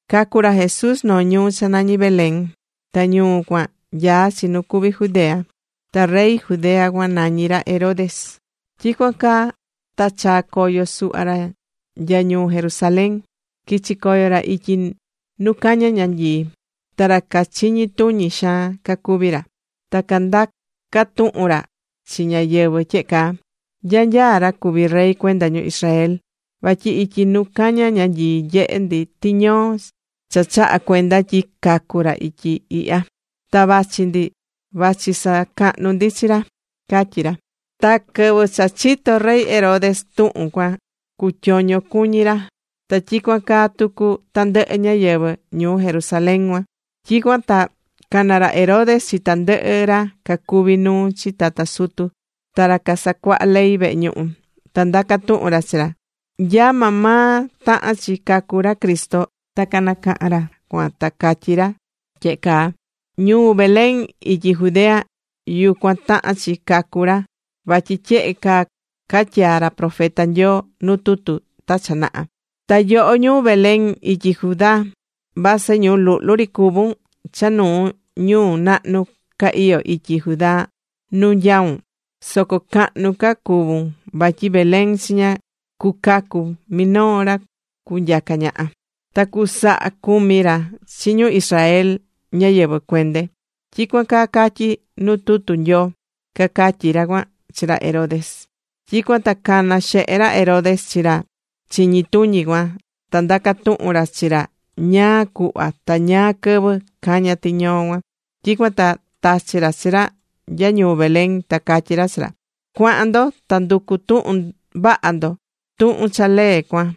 Cacu̱ ra Jesús noo ñuu cha nañí Belén. Ta ñuu cuan nyaá chi nu cuví Judea. Ta rey Judea cuan nañí ra Herodes. Tyicuan ta chaa̱ coyo suhva ra nya ñuu Jerusalén. Quichi̱ coyo ra ityi nu caña ñanyii. Ta ra cachiñi tuñi xaan cacuví ra. Ta candaca̱ tuhun ra chi ñáyɨvɨ tyehe caa: ―¿Nya nyaá ra cuvi rey cuenda ñu Israel? Vatyi ityi nu caña ñanyii nyehe̱ ndi tiñoo cha chaha̱ cuenda tyi cacu̱ ra ityi ihya. Ta vachi ndi vachi sacahnu ndi chi ra ―cacatyí ra. Ta quɨvɨ cha chito̱ rey Herodes tuhun cuan cutyoño cuñí ra. Ta tyicuan caa tucu tandɨhɨ ñáyɨvɨ ñuu Jerusalén cuan. Tyicuan ta cana̱ ra Herodes chi tandɨhɨ ra cacuví nuu chi tata sutu ta ra casacuahá ley vehe ñuhu. Ta ndaca̱ tuhun ra chi ra, nya maa maa tahán chi cacu ra Cristo. Ta canacaha̱n ra cuan ta cacatyí ra tyehe caa: ―Ñuu Belén ityi Judea, yucuan tahán chi cacu ra vatyi tyehe caa catyaa̱ ra profeta Nyoo nu tutu ta cha naha: Ta yoho ñuu Belén ityi Judá, vasɨ ñuu luhlu ri cuvún cha nuu ñuu nahnu ca iyó ityi Judá nu nyaún. Soco cahnu ca cucuvun vatyi Belén chiña cucacu minoo ra cunyaca ñaha. Ta cusaha cumi ra chi ñu Israel ñáyɨvɨ cuende. Tyicuan caa catyí nu tutu Nyoo, ―cacatyí ra cuan chi ra Herodes. Tyicuan ta cana̱ xehe ra Herodes chi ra chiñi tuñi cuan, ta ndaca̱ tuhun ra chi ra ñáá cuhva ta ñáá quɨvɨ caña̱ tiñoo cuan. Tyicuan ta tachi̱ ra chi ra nya ñuu Belén, ta catyí ra chi ra: ―Cua̱han ndo, ta ndu̱cu tuhun vaha ndo tuhun cha lee cuan.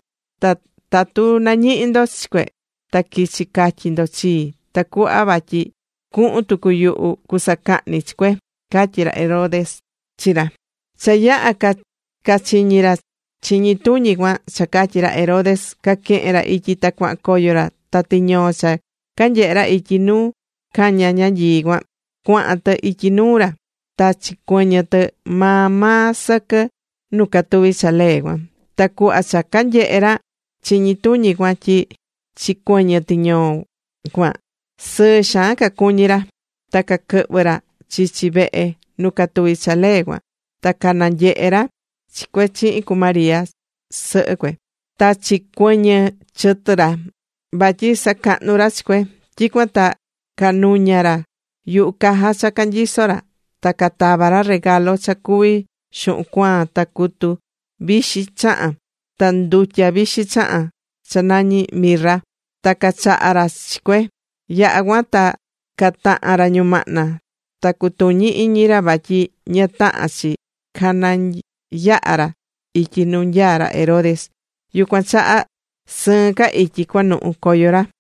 Ta tatu nañihi ndo chi cue, ta qui̱chi catyi ndo chii, tacuhva vatyi cuhun tucu yuhu cusacahni chi cue ―catyí ra Herodes chi ra. Cha yaha̱ cachiñi ra chiñi tuñi cuan cha catyi̱ ra Herodes, caquehen ra ityi ta cuahan coyo ra. Ta tiñoo cha canyehe̱ ra ityi nu cañá ñanyii cuan, cuahan tɨ ityi nuu ra. Ta chicuɨñɨ̱ tɨ maa maa sɨquɨ nu catuví cha lee cuan. Ta cuhva cha canyehe̱ ra chiñi tuñi cuan tyi chicuɨñɨ̱ tiñoo cuan, sɨɨ xaan cacuñi̱ ra. Ta caquɨhvɨ̱ ra chichi vehe nu catuví cha lee cuan. Ta cananyehe̱ ra chi cue chihin cu María sɨhɨ cue. Ta chicuɨñɨ chɨtɨ ra vatyi sacahnu ra chi cue. Tyicuan ta canuña̱ ra yuhu caja cha canyisó ra. Ta catava̱ ra regalo cha cuví xuhun cuaan, ta cutu vixi chahán, ta ndutya vixi chahán cha nañí mirra. Ta cachaha̱ ra chi cue. Yaha̱ cuan ta cataha̱n ra ñumahna ta cutuñi iñi ra vatyi ña tahán chi canayaha ra ityi nu nyaá ra Herodes, yucuan chaha sɨɨn ca ityi cuanuhu coyo ra.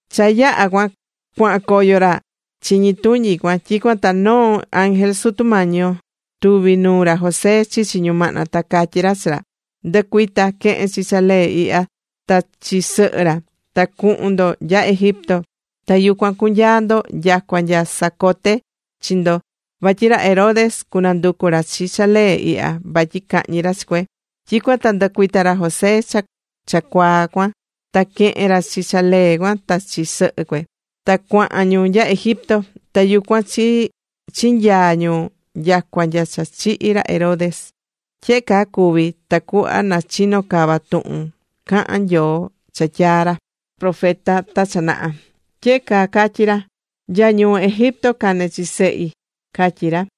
Cha yaha̱ cuahan coyo ra chiñi tuñi cuan, tyicuan ta noo ángel Sutu Mañi yo tuvi̱ nuu ra José chichi ñumahna. Ta catyí ra chi ra: ―Ndɨ̱cuita, que̱hen chi ra lee ihya, ta chi sɨhɨ ra, ta cuhun ndo nya Egipto. Ta yucuan cu̱nyaa ndo nyacua nya sacote chi ndo. Vatyi ra Herodes cunanducu ra chi cha lee ihya vatyi cahñi ra chi cue. Tyicuan ta ndɨcuita̱ ra José cha cuaa cuan. Ta quehe̱n ra chi cha lee cuan ta chi sɨhɨ cue. Ta cuahan ñu nya Egipto. Ta yucuan chinyaa̱ ñu nyacua nya cha chihi̱ ra Herodes. Tyehe caa cuvi̱ tacuhva na chino cava tuhun cahán Nyoo cha tyaa̱ ra profeta ta cha naha. Tyehe caa catyí ra: “Nya ñuu Egipto cane̱ chi Sehi”, catyí ra.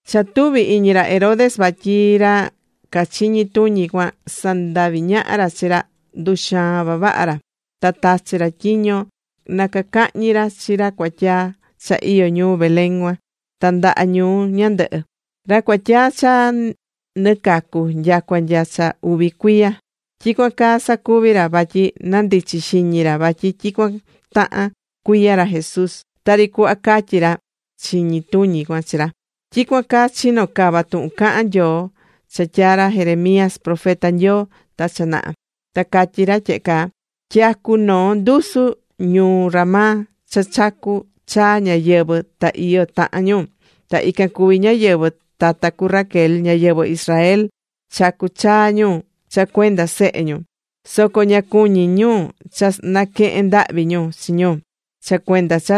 Cha tuvi̱ iñi ra Herodes vatyi ra cachiñí tuñi cuan sandavi̱ ñaha ra chi ra, nduxaa̱n vavaha ra. Ta tachi̱ ra tyiño na cacahñi ra chi ra cuatyaa cha iyó ñuu Belén cuan ta ndaha ñuu ñandɨhɨ, ra cuatyaa cha nɨ cacu nyacua nya cha uvi cuiya. Tyicuan caa sacuvi̱ ra vatyi nandichi̱ xiñi ra vatyi tyicuan tahan cuiya ra Jesús tari cuhva catyi̱ ra chiñi tuñi cuan chi ra. Tyicuan caa chino̱ cava tuhun cahán Nyoo cha tyaa̱ ra Jeremías profeta Nyoo ta cha naha, ta catyi̱ ra tyehe caa: Tyacú noo ndusu ñuu Ramá, cha chacú chaa ñáyɨvɨ, ta iyo tahan ñu. Ta ican cuví ñáyɨvɨ tata cu Raquel, ñáyɨvɨ Israel, chacú chaa ñu cha cuenda sehe ñu. Soco ña cuñí ñu cha naquehen ndahvi ñu chi ñu cha cuenda cha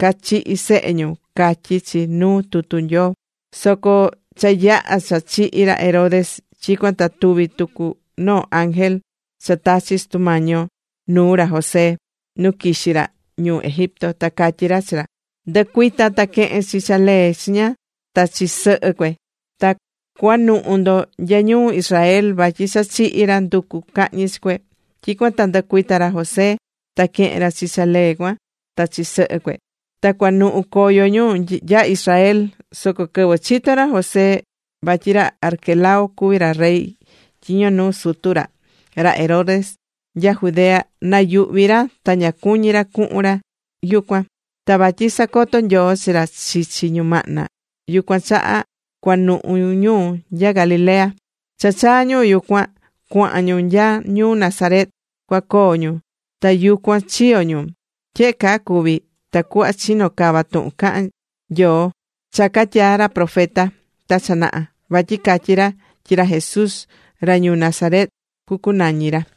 cachihi̱ sehe ñu, catyí chi nuu tutu Nyoo. Soco cha yaha̱ cha chihi̱ ra Herodes, tyicuan ta tuvi̱ tucu noo ángel cha tachi̱ Sutu Mañi yo nuu ra José nu quixí ra ñuu Egipto. Ta catyí ra chi ra: ―Ndɨ̱cuita ta que̱hen chi cha lee chiña, ta chi sɨhɨ cue. Ta cua̱nuhu ndo nya ñuu Israel, vatyi cha chihi̱ ra nducu̱ cahñi chi cue. Tyicuan ta ndɨcuita̱ ra José, ta quehe̱n ra chi cha lee cuan ta chi sɨhɨ cue. Ta cuanuhu̱ coyo ñu nya Israel. Soco quɨvɨ chito̱ ra José vatyi ra Arquelao cuví ra rey tyiño nuu sutu ra, ra Herodes, nya Judea, nayuhvi̱ ra ta ña cuñí ra cuhun ra yucuan. Ta vatyi sacoto̱ Nyoo chi ra chichi ñumahna, yucuan chaha cuanuhu ñu nya Galilea. Cha chaa̱ ñu yucuan, cuahan ñu nya ñuu Nazaret, cua coo ñu. Ta yucuan chiyo̱ ñu. Tyehe caa cuvi̱ tacuhva chino cava tuhun cha cahán Nyoo, cha catyaa̱ ra profeta ta cha naha. Vatyi catyi̱ ra tyi ra Jesús ra ñuu Nazaret cucunañi ra.